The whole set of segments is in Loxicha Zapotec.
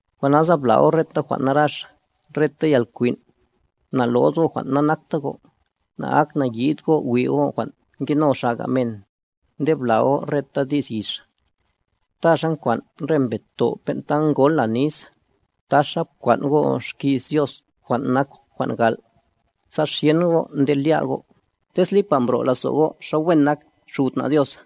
Jwan' nasa bla' go' reta jwan' narax, reta yalkwin', na'lo'd go' jwan' nanakta go', na'aknayi'd go' wi' go' jwan' ngeno xaga men, nde bla' go' reta di's yix. Ta xa nkwan' re mbed to' ben'ta ngola nis, taxa pkwan' go' xki's Dios jwan' nak jwan' gal', sa xyen go' nde lya' go', tez lipa mbro' lazo' go' xa wen nak Xud na Dios.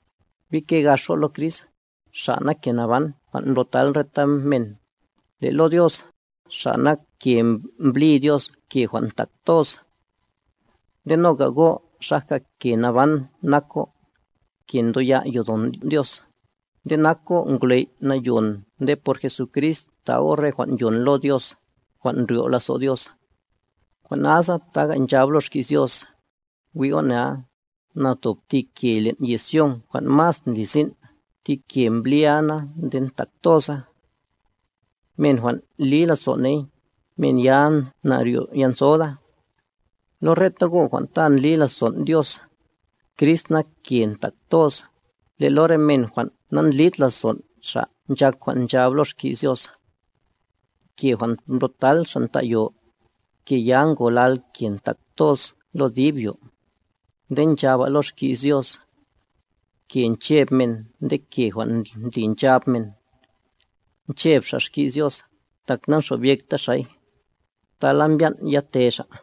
Bike gax go' lo Crist, Xa' nak ke naban jwan' mblo'tal reta men, le' lo Dios, Xa' nak ke mblí Dios ke jwan' ntak toz. Nde noga go' xaja ke naban nak go', ke ndoya' yodon' Dios, nde nak go' ngwley' nayon nde por Jesucrist ta' go' re jwan' yon lo Dios, jwan' ndryo' lazo' Dios. Jwan' nasa noga nchab lo Xki's Dios: Wi' go' nea, na tob ti ke len' yez Sion jwan' mas ndli sin', thi ke mblía na nde ntak toza, men jwan' li lazo' ney, men ya na'ryo'yanthoda. Lo reta go' jwan' ta ndli lazon' Dios, Crist nak ke ntak toz, le' lo re men jwan' nandlid lazon' Xa' nchak jwan' nchab lo xki's Dios: Ke jwan' mblo'tal xa' nta' yo, ke ya ngolal ke ntak toz lo dib yo. Nde nchaba' lo xki's Dios: Ke ncheb men nde ke jwan' ndli nchab men. Ncheb xa' xki's Dios, tak namxobyekta xa'y, tala mbyan' yate xa'.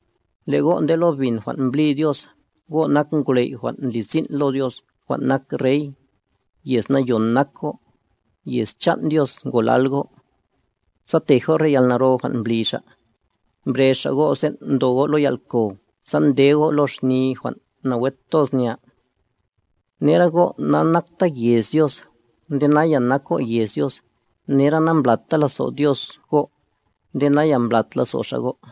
Le' go' nde lo bin jwan' mblí Dios, go' nak ngwley' jwan' ndli sin' lo Dios jwan' nak rey, yez nayon nak go', yez chan' Dios ngolal go'. Sa tej go' re yalnaro jwan' mbli Xa', mbrez Xa' go' sen' ndo go' lo yal'kow sa nde go' lo xni jwan' nawe toz nya. Nera go' nanakta yez Dios, nde naya nak go' yez Dios, nera namblata lazo' Dios go', nde naya mblat lazo' Xa' go'.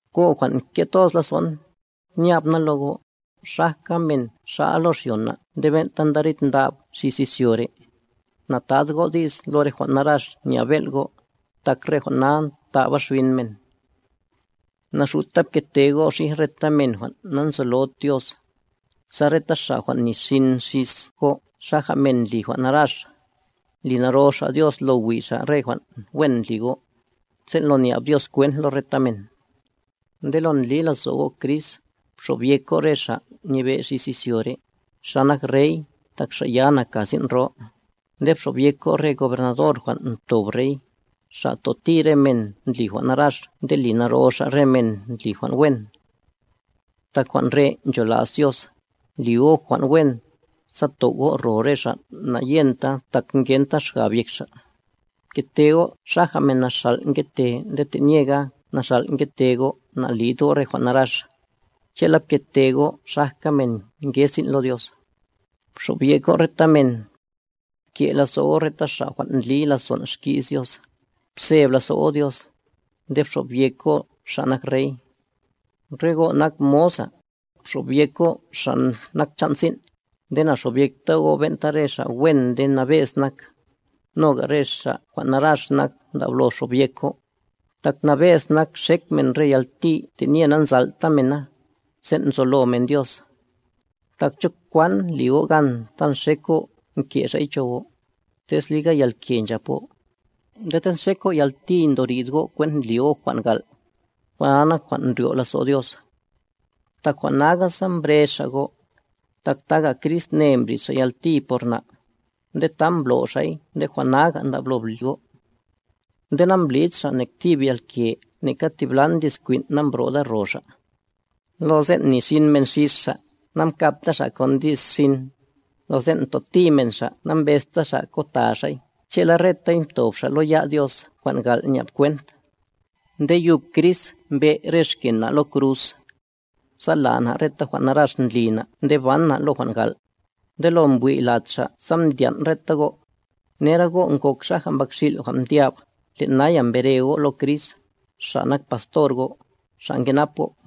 Go' jwan' nke' toz lazo'n, nya'b na lo go', xajka men xa'a lo xyona nde ben'ta ndarid ndab xis izyo re', nata'd go' di's lo re jwan' narax nya'b bel' go', tak re jwan' na ntaba xbin men. Naxuta pkete go' xij reta men jwan' nanzolod Dios, sa reta xa' jwan' ni xin xis go' xaja men ndli jwan' narax, li naro xa' Dios, lo wi' xa' re jwan' wen ndli go', sen' lo nya'b Dios kwent lo reta men. Nde lo ndli lazo' go' Crist, bxobyek go' re xa' nyebe' xis izyo re', xa nak rey, tak xa' ya naka sin' ro, nde bxobyek go' re gobernador jwan' mtob rey, xa' toti re men ndli jwan' narax nde li naro xa' re men ndli jwan' wen. Tak jwan' re' nchola's Dios, li go' jwan' wen, sa tow' go' ro re xa' na'yenta tak ngenta xgab yek xa'. Pkete go' xaja men naxàl' ngete nde te'nyega naxàl' ngete go' nalid go' re jwan' narax. Che'la pkete go' xajka men nge sin' lo Dios. Bxobyek go' reta men. Pke' lazo' go' reta xa' jwan' ndli lazon' xki's Dios, pseb lazo' go' Dios, nde bxobyek go' xa' nak rey. Re go' nak moza, bxobyek go' xa' nak chan' sin', nde na'xobyekta go' ben'ta re xa' wen nde nabe'z nak, noga re xa' jwan' narax nak ndablo bxobyek go'. Tak nabe'z nak xek men re yalti tenye nanzal'ta mena, sen' nzolo men Dios. Tak, ¿cho kwan li go' gan ta nxek go' nke' xay cho go', tez liga yalke nchap go'?, nde tez nxek go' yalti ndorid go' kwent ndli go' jwan' gal', jwan' na nak jwan' ndryo' lazo' Dios. Tak jwan' naga sa mbrez Xa' go', tak taga Crist ne mbrid Xa' yalti por na', nde ta mblo' Xa'y nde jwan' naga' ndablo li go'. Nde namblid Xa' nek thib yalke neka thiblan di's kwin' nambrod ro' Xa'. Lo sen' mnixin men xis Xa', nankabta Xa' kon di's xin, lo sen' mtoti men Xa' nambezta Xa' kota Xa'y, che'la retay mtob Xa' lo ya' Dios jwan' gal' nya'b kwent. Nde yub Crist mbe' re xken na' lo kruz, sa la' na' reta jwan' narax ndli na' nde ban na' lo jwan' gal'. Nde lo mbwi' lad Xa' sa mdyan' reta go'. Nera go' ngok xaja mbakxil' jwan' mdyab, le' naya mbere go' lo Crist, Xa' nak pastor go', Xa' nkenap go'.